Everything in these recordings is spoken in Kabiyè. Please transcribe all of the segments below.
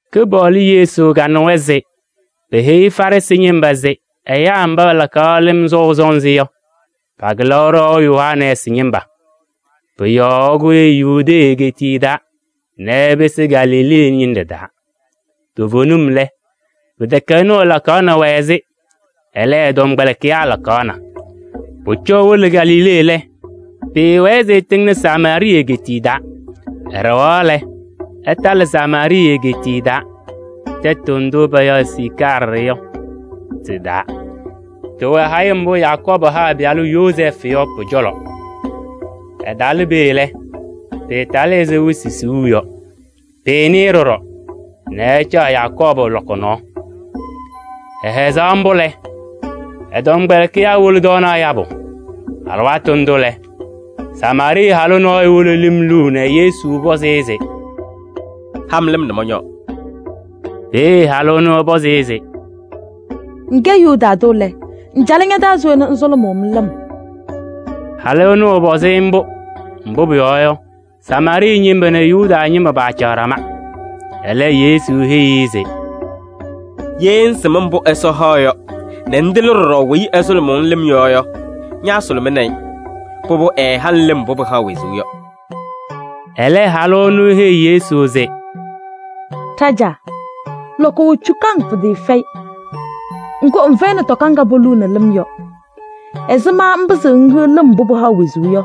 Kɩpaɣlʋ Yesu kanɩwa se peheyi Farɩsɩ ñɩma se ɛyaa mba ɛlakaɣ lɩm sɔʋ sɔnzɩ yɔ, pakɩlaɣ ɖɔʋ Yohanɛɛsɩ ñɩma. Pʋ-yɔɔ ɛkʋyɩ Yudee egeetiye taa nɛ ɛpɩsɩ Galilee ñɩnɖɛ taa. Toovenim lɛ, pɩtɛkɛ ɛnʋ lakaɣnɩ-wɛ-sɩ, ɛlɛ, ɛ-tɔmkpɛlɩkɩyaa lakaɣna. Pʋcɔ ewolo Galilee lɛ, pɩɩwɛɛ se ɛtɩŋnɩ Samaarɩɩ egeetiye taa. Ɛɖɛɣaɣ lɛ, ɛtalɩ Samaarɩɩ egeetiye taa tɛtʋ ndʋ payaɣ se Siicaarɩ yɔ tɩ-taa. Tɩwɛ hayɩm mbʋ Yakɔɔbʋ ha ɛ-pɩyalʋ Yozɛɛfʋ yɔ pʋ-cɔlɔ. Ɛtalɩ peeye lɛ, pɩtalɩ ɛzɩ wɩsɩ siɣu yɔ. Pɩɩnɩ-ɩ ɖɔɖɔ, nɛ ɛcaɣ Yakɔɔbʋ lɔkɔ nɔɔ. Ɛhɛzaɣ mbʋ lɛ, ɛ-tɔmkpɛlɩkɩyaa wolo tɔɔnaɣ yabʋ. Alɩwaatʋ ndʋ lɛ, Samaarɩɩ halʋ nɔɔyʋ wolo lɩm luu nɛ Yesu pɔzɩ-ɩ se: “Ha-m lɩm nɛ mɔñɔɔ.” Peeye halʋ ɛnʋ ɛpɔzɩ-ɩ se: “Ŋkɛ Yuda tʋ lɛ, ŋcalɩ ña-taa se we nɛ ŋsʋlʋmʋʋ-m lɩm?” Halʋ ɛnʋ, ɛpɔzɩ-ɩ mbʋ, mbʋ pʋyɔɔ yɔ, Samaarɩɩ ñɩma nɛ Yuda ñɩma paacaɣ ɖama. Ɛlɛ Yesu heyi-i se: “Ye ŋŋsɩm mbʋ Ɛsɔ haɣ yɔ nɛ ŋtɩlɩ ɖɔɖɔ weyi ɛsʋlʋmʋʋ-ŋ lɩm yɔ yɔ, ñaasʋlʋmɩnɩ-ɩ, pʋbʋ ɛɛha-ŋ lɩm mbʋ pɩhaɣ wezuu yɔ.” Ɛlɛ halʋ ɛnʋ eheyi Yesu se: “Ɖajaa! Lɔkɔ wɛ cukaŋ pɩtɩɩfɛyɩ, ŋgʋ ŋfɛyɩnɩ tɔka ŋga poluuni lɩm yɔ. Ɛzɩma ŋpɩzɩɣ ŋhiɣ lɩm mbʋ pɩhaɣ wezuu yɔ?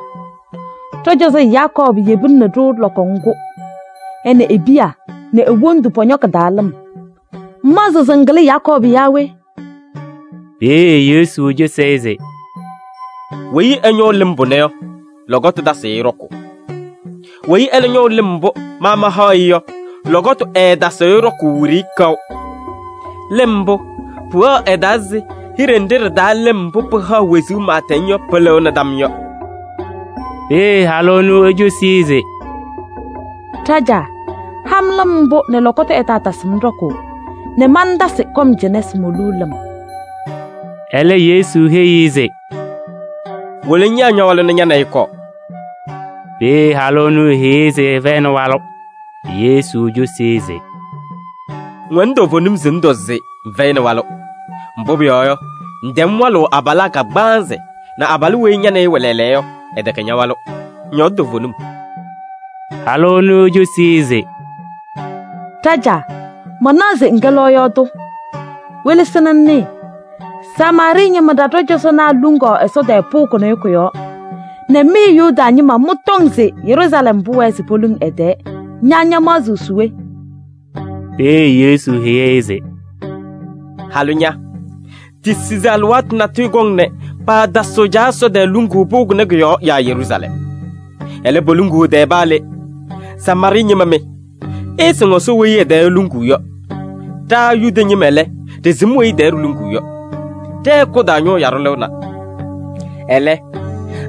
Ɖɔ-cɔzɔ Yakɔɔbʋ yebinini-ɖʋ lɔkɔ ŋgʋ. Ɛ nɛ e-piya nɛ e-wondu pɔñɔ kɩ-taa lɩm. Ŋmaɣzɩɣ se ŋkɩlɩ Yakɔɔbʋ yaa we?” Peeye Yesu cosi-i se: “Weyi ɛñɔʋ lɩm pʋnɛ yɔ, lɔkɔtʋ tasɩɣ-ɩ ɖɔkʋʋ. Weyi ɛlɛ ñɔʋ lɩm mbʋ ma mahaɣ-ɩ yɔ, lɔkɔtʋ ɛɛtasɩɣ-ɩ ɖɔkʋʋ wiɖiyi kaʋ. Lɩm mbʋ, pʋwɛɣ ɛ-taa ɛzɩ hiɖe nɖɩ ɖɩ-taa lɩm mbʋ pɩhaɣ wezuu pɩɩtɛŋ yɔ pɩlɩɣnɩ tam yɔ.” Peeye halʋ ɛnʋ ecosi-i se: “Ɖajaa! Ha-m lɩm mbʋ nɛ lɔkɔtʋ ɛtaatasɩ-m ɖɔkʋʋ nɛ mantasɩ kɔm cɩnɛ se moluu lɩm.” Ɛlɛ Yesu heyi-i se: “Wolo ŋyaa ña-walʋ nɛ ña nɛ ɩ ɩkɔɔ.” Peeye halʋ heyi-i se ɛfɛyɩnɩ walʋ. Yesu cosi-i se: “Ŋwɛnɩ toovenim se ŋtɔ se ŋfɛyɩnɩ walʋ, mbʋ pʋyɔɔ yɔ, ŋtɛm walʋʋ abalaa kagbaanzɩ nɛ abalʋ weyi ña nɛ ɩ ɩwɛ lɛɛlɛɛyɔ yɔ, ɛtɛkɛ ña-walʋ. Ŋyɔɔdɩ toovenim.” Halʋ ɛnʋ ecosi-i se: “Ɖajaa! Manaɣ se ŋkɛ lɔɔyaɣ tʋ. Welesi ŋnɩɩ, Samaarɩɩ ñɩma ɖa, ɖɔ-cɔzɔnaa luŋaɣ Ɛsɔ tɛɛ pʋʋ kʋnɛ kʋ-yɔɔ nɛ mɩ Yuda ñɩma mɩtɔŋ se Yeruusalɛm pʋwɛɛ se poluŋ ɛ-tɛɛ. Ña ñamaɣzɩɣ se we?” Peeye Yesu heyi-i se: “Halʋ ña! Tisi se alɩwaatʋ natʋyʋ kɔŋ nɛ paatasɩɣ Caa Ɛsɔ tɛɛ luŋuu pʋʋ kʋnɛ kʋ-yɔɔ yaa Yeruusalɛm. Ɛlɛ, poluŋuu ɛ-tɛɛ paa le. Samaarɩɩ ñɩma mɩ! Ɩɩsɩŋ Ɛsɔ weyi ɛ-tɛɛ iluŋuu yɔ. Ɖa Yuda ñɩma lɛ, ɖɩsɩm weyi ɛ-tɛɛ ɖiluŋuu yɔ: ɖɛ-hɛkʋ taa ñʋʋ yaɖʋ lɩɣna. Ɛlɛ,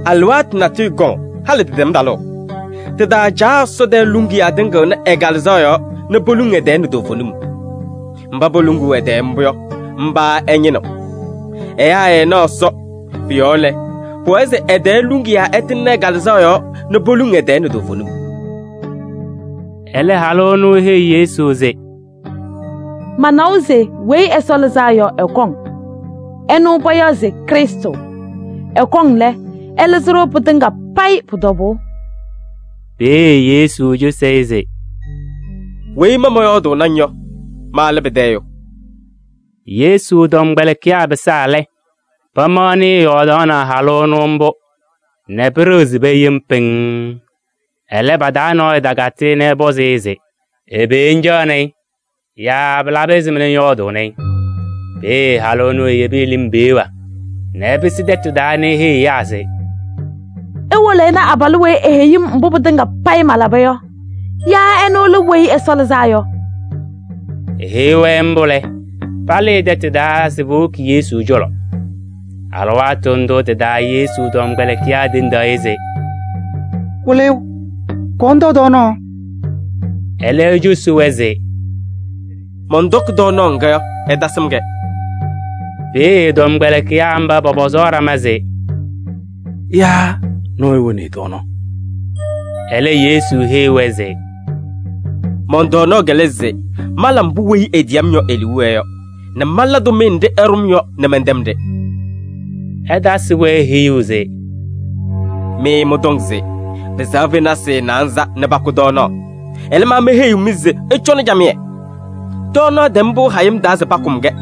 alɩwaatʋ natʋyʋ kɔŋ, halɩ tɩtɛm talʋʋ. Tɩ-taa Caa Ɛsɔ tɛɛ luŋiyaa tɩŋɩɣnɩ ɛ-Kalɩzaɣ yɔɔ nɛ poluŋ ɛ-tɛɛ nɛ toovenim. Mba poluŋuu ɛ-tɛɛ mbʋ yɔ, mba ɛñɩnɩɣ. Ɛyaa ɛɛnaɣ Ɛsɔ. Pʋ-yɔɔ lɛ, pʋwɛɛ se ɛ-tɛɛ luŋiyaa ɛtɩŋnɩ ɛ-Kalɩzaɣ yɔɔ nɛ poluŋ ɛ-tɛɛ nɛ toovenim.” Ɛlɛ halʋ ɛnʋ eheyi Yesu se: “Manawa se Weyi Ɛsɔ Lɩzaa yɔ ɛkɔŋ, ɛnʋ payaɣ se Krɩstʋ. Ɛkɔŋ lɛ, ɛlɩzɩ-ɖʋ pɩtɩŋa payɩ pʋ-tɔbʋʋ.” Peeye Yesu cosi-i se: “Weyi ma mɔyɔɔdʋʋnɩ-ŋ yɔ, ma lɛ pɩtɛ ɛyʋ.” Yesu tɔmkpɛlɩkɩyaa pɩsaa lɛ, pamaɣnɩ ɛyɔɔdaɣnɩ halʋ ɛnʋ mbʋ nɛ pɩɖɩɣzɩ-wɛ yem pɩŋŋ. Ɛlɛ, pa-taa nɔɔyʋ takatɩ nɛ ɛpɔzɩ se: “Ɛbɛ ŋcaɣnɩ-ɩ?” yaa “Pɩlabɩ ɛzɩma nɛ ŋyɔɔdʋʋnɩ-ɩ?” Peeye halʋ ɛnʋ eyebi ɛ-lɩm peɣa nɛ ɛpɩsɩ tɛtʋ taa nɛ eheyiɣ ɛyaa se: “Iwolo ɩna abalʋ weyi eheyi-m mbʋ pɩtɩŋa payɩ malaba yɔ. Yaa ɛnʋ lɛ Weyi Ɛsɔ Lɩzaa Yɔ?” Eheyi-wɛ mbʋ lɛ, palɩɩ tɛtʋ taa se powoki Yesu cɔlɔ. Alɩwaatʋ ndʋ tɩ-taa Yesu tɔmkpɛlɩkɩyaa tendaɣ-ɩ se: “Wɩlɩyʋ! Kɔɔ ŋtɔɔ tɔɔnaɣ.” Ɛlɛ, ecosi-wɛ se: “Mɔntɔkɩ tɔɔnaɣ ŋga yɔ, ɩtasɩm-kɛ.” Peeye tɔmkpɛlɩkɩyaa mba pɔpɔzaɣ ɖama se: “Yaa nɔɔyʋ woni-i tɔɔnaɣ?” Ɛlɛ Yesu heyi-wɛ se: “Mɔn-tɔɔnaɣ lɛ se mala mbʋ weyi etiyi-m yɔ e-liu wɛɛ yɔ nɛ mala tʋmɩyɛ nɖɩ ɛɖʋ-m yɔ nɛ mɛntɛm-ɖɩ.” Ɛtasɩ-wɛ heyuu se: “Mɩ mɩtɔŋ se pɩsɛɣ fenasɩ naanza nɛ pakʋ tɔɔnaɣ, ɛlɛ, ma meheyiɣ-mɩ se ɩcɔnɩ camɩyɛ, tɔɔnaɣ tɛm pɩʋ hayɩm taa se pakʋm-kɛ.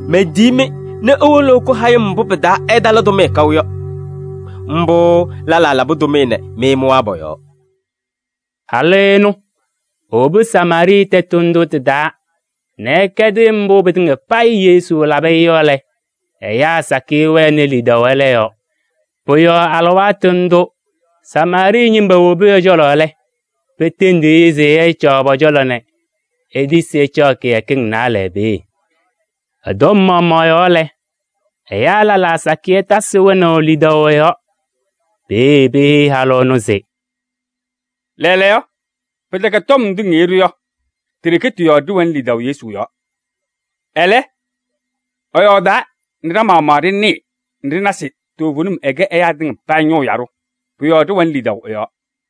Mentiyi-mɩ nɛ iwolo ɩkʋ hayɩm mbʋ pɩ-taa ɩtala tʋmɩyɛ kaʋ yɔ. Mbʋ lɛlaa labɩ tʋmɩyɛ nɛ mɩ mɩwaa pɔ-yɔɔ.” Halʋ ɛnʋ, ewobi Samaarɩɩ tɛtʋ ndʋ tɩ-taa nɛ ɛkɛdɩ mbʋ pɩtɩŋa payɩ Yesu labɩ-ɩ yɔ lɛ, ɛyaa sakɩyɛ wɛnɩ lidaʋ ɛlɛ yɔɔ. Pʋ-yɔɔ alɩwaatʋ ndʋ Samaarɩɩ ñɩma wobi ɛ-cɔlɔ lɛ, petendi-i se ɛcaɣ pɔ-cɔlɔ nɛ etisi ɛcaɣ kɩyakɩŋ naalɛ peeye. Ɛ-tɔm maɣmaɣ yɔɔ lɛ, ɛyaa lɛlaa sakɩyɛ tasɩ wɛnaʋ lidaʋ ɛ-yɔɔ. Peeye peheyi halʋ ɛnʋ se: “Lɛɛlɛɛyɔ, pɩtɛkɛ tɔm ndʋ ŋheyi-ɖʋ yɔ, ti-ɖeke tɩ-yɔɔ ɖɩwɛnɩ lidaʋ Yesu yɔɔ. Ɛlɛ, ɛyɔɔdaa nɛ ɖa-maɣmaɣ ɖɩnɩɩ nɛ ɖɩna se toovenim ɛkɛ ɛyaa tɩŋa payɩ ñʋʋ yaɖʋ, pʋ-yɔɔ ɖɩwɛnɩ lidaʋ ɛ-yɔɔ.”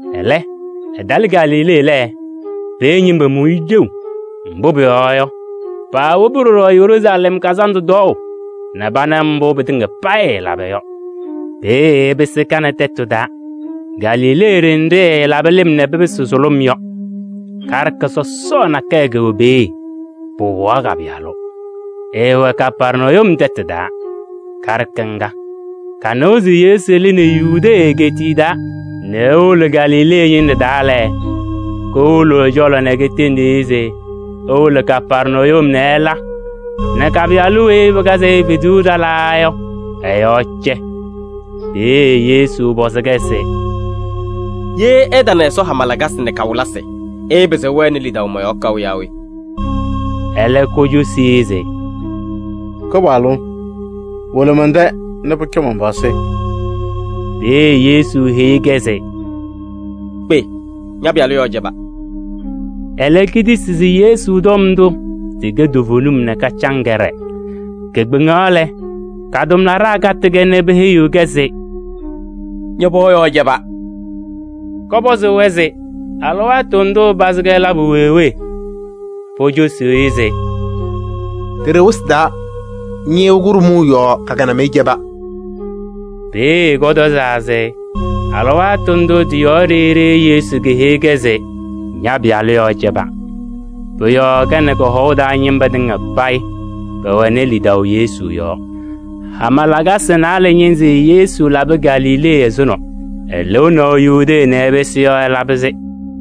Ɛlɛ, ɛtalɩ Galilee lɛ, peeye ñɩma mʋ-ɩ ɖeu. Mbʋ pʋyɔɔ yɔ, paawobi ɖɔɖɔ Yeruusalɛm kazandʋ tɔɔʋ nɛ pana mbʋ pɩtɩŋa payɩ ɛɛlaba yɔ. Peeye ɛpɩsɩ Kana tɛtʋ taa Galilee ɖenɖe ɛɛlaba nɛ lɩm pɩsɩ sʋlʋm yɔ. Karɩka sɔsɔɔ nakɛyɛ kɛwɛ peeye, pɩwɩɣaɣ ka-pɩyalʋ. Ɛɛwɛ Kapɛrnayum tɛtʋ taa. Karɩka ŋga, kanɩwa se Yesu lɩnɩ Yudee egeetiye taa nɛ ewolo Galilee ñɩnɖɛ taa lɛ, kowolo ɛ-cɔlɔ nɛ ketendi-i se ewolo Kapɛrnayum nɛ ɛla nɛ ka-pɩyalʋ weyi pɩkazɩ-ɩ fezuu ɖalaa yɔ, ɛ-yɔɔ cɛ. Peeye Yesu pɔzɩ-kɛ se: “Ye ɩtana Ɛsɔ hama lakasɩ nɛ kawɩlɩsɩ, ɩɩpɩzɩɣ ɩwɛnɩ lidaʋ mɔ-yɔɔ kaʋ yaa we?” Ɛlɛ kocosi-i se: “Kɩpaɣlʋ! Wolo mɛn-tɛ nɛ pʋcɔ man-pɩɣa sɩ.” Peeye Yesu heyi-kɛ se: “Kpe! Ña-pɩyalʋ yɔɔ cɛba.” Ɛlɛ ketisi se Yesu tɔm ndʋ tɩkɛ toovenim nɛ kacaŋ kɛɖɛɛ. Kekpeŋaɣ lɛ, ka-tʋmlaɖaa katɩ-kɛ nɛ peheyi-kɛ se: “Ña-pɩɣa yɔɔ cɛba!” Kɔpɔzɩ-wɛ se alɩwaatʋ ndʋʋ pɩpazɩ-kɛ labʋ wee wee? Pocosi se: “Ɖeɖe wɩsɩ taa ñɩɣyʋʋ kʋɖʋmʋʋ yɔɔ ka-kɩnamɩyɛ cɛba.” Peeye kɔtɔzaa se alɩwaatʋ ndʋ tɩ-yɔɔ ɖeyi ɖeyi Yesu keheyi-kɛ se: “Ña-pɩyalʋ yɔɔ cɛba.” Pʋ-yɔɔ ka nɛ kɔ-hɔʋ taa ñɩma tɩŋa payɩ pɛwɛnɩ lidaʋ Yesu yɔɔ. Hama lakasɩ naalɛ ñɩnzɩ Yesu labɩ Galilee ɛzʋnɔ. Ɛlɩnaʋ Yudee nɛ ɛpɩsɩ yɔ ɛlabɩ-sɩ.